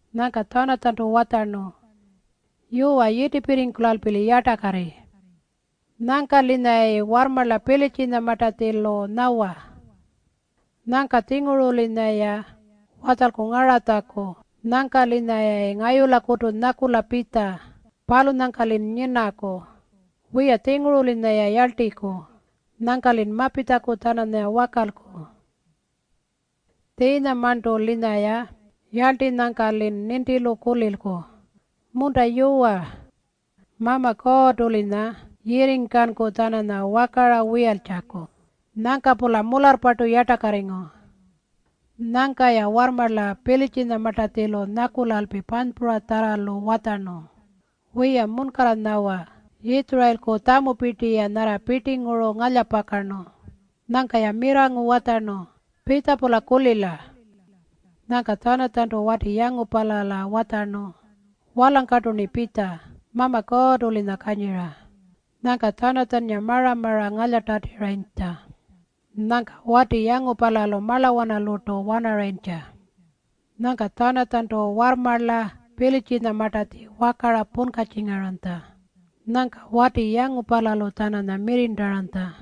Nyangka Tjanatjantu watjarnu, “Yuwa, yitipirringkulalpi-li yartakarri. Nyangka-linyayayi warrmarla Pilitjinyamartatjilu nyawa. Nyangka-tjinguru-linyaya watjalku ngaratjaku nyangka-linyayayi ngayulakutu nyakula pitja. Palunyangka-lin nyinaku. Wiya-tjinguru-linyaya yarltiku. Nyangka-lin mapitjaku-tjananya wakalku. Tjiinyamarntu-linyaya yarltinyangka-lin nintilu kulilku, ‘Munta yuwa. Mama Kuurrtu-linya yirringkanku-tjananya wakara wiyaltjaku.’” Nyangka-pula mularrpartu yartakarringu. Nyangka-ya warrmarla Pilitjinyamartatjilu nyakulalpi panypuratjarralu watjarnu, “Wiya, munkarra nyawa. Yitjurayilku tjamupirti-ya nyarra pirtinguru ngalyapakarnu.” Nyangka-ya mirrangu watjarnu, “Pitja-pula kulila.” Nyangka Tjanatjantu wati yangupala watjarnu, “Walangkartu-rni pitja. Mama Kuurrtu-linya kanyira.” Nyangka Tjanatjannga mara-mara ngalyatatirayintja. Nyangka wati yangupalalu marlawanalurtu wanarayintja. Nyangka Tjanatjantu warrmarla Pilitjinyamartatji wakara punkatjingaranytja. Nyangka wati yangupalalu-tjananya mirrirntaranytja.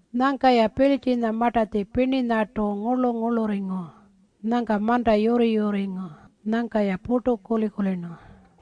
Nyangka-ya Pilitjinyamartatji pirninyartu ngurlu-ngurlurringu. Nyangka manta yurri-yurringu. Nyangka-ya purtu kuli-kulirnu.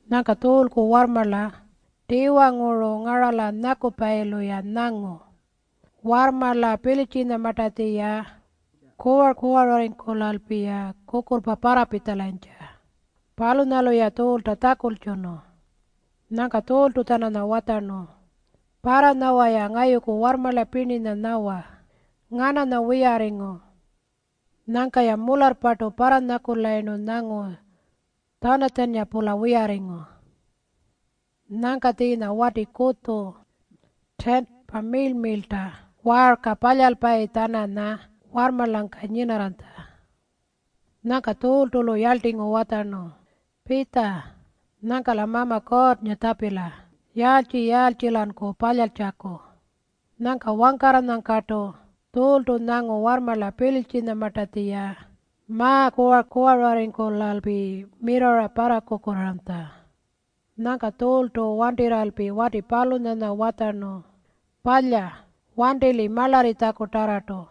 Nyangka Tjuulku warrmarla tiwanguru ngarala nyakupayilu-ya nyangu warrmarla Pilitjinyamartatji-ya kuwar-kuwararringkulalpi kukurrpa parrapitjalayintja. Palunyalu-ya Tjuulta tjakultjunu. Nyangka Tjuultu-tjananya watjarnu, “Parranyawa-ya ngayuku warrmarla pirninya nyawa, ‘Ngananya wiyarringu?’” Nyangka-ya mularrpartu parranyakulayirnu nyangu Tjanatjannga-pula wiyarringu. Nyangka tjiinya wati kutju tiinti miirl-miirlta waarka palyalpayi-tjananya warrmarlangka nyinarranytja. Nyangka Tjuultu-lu yarltingu watjarnu, “Pitja. Nyangka-la Mama Kuurrnga tjapila yaaltji-yaaltji-lanku palyaltjaku.” Nyangka wangkarranyangkartu Tjuultu nyangu warrmarla Pilitjinyamartatji-ya ma-kuwar-kuwararringkulalpi mirrarra parrakukurraaranytja. Nyangka Tjuultu wantirralpi wati palunyanya watjarnu, “Palya. Wanti-li marlarritjakutarrartu.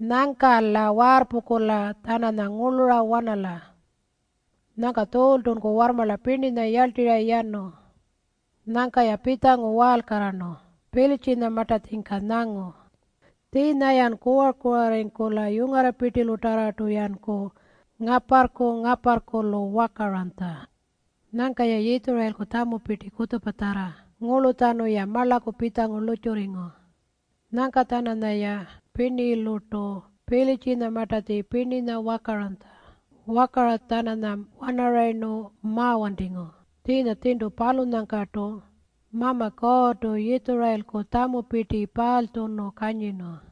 Nyangka-la waarrpungkula-tjananya ngurlura wanala.” Nyangka Tjuultunku warrmarla pirninya yarltirra yanu. Nyangka-ya pitjangu waalkarrarnu Pilitjinyamartatjingka nyangu tjiinya-ya kuwar-kuwararringu yungarrapirtilutarrartu-yanku ngaparrku-ngaparrkulu wakaranytja. Nyangka-ya Yitjurayilku tjamupirti kutjupatjarra ngurlutjanu-ya marlaku pitjangu lurrtjurringu. Nyangka-tjananyaya pirnilurtu Pilitjinyamartatji pirninya wakaranytja. Wakara-tjananya wanarayirnu mawantingu. Tjiinya tjirntu palunyangkartu Mama Kuurrtu Yitjurayilku tjamupirti paalytjunu kanyirnu.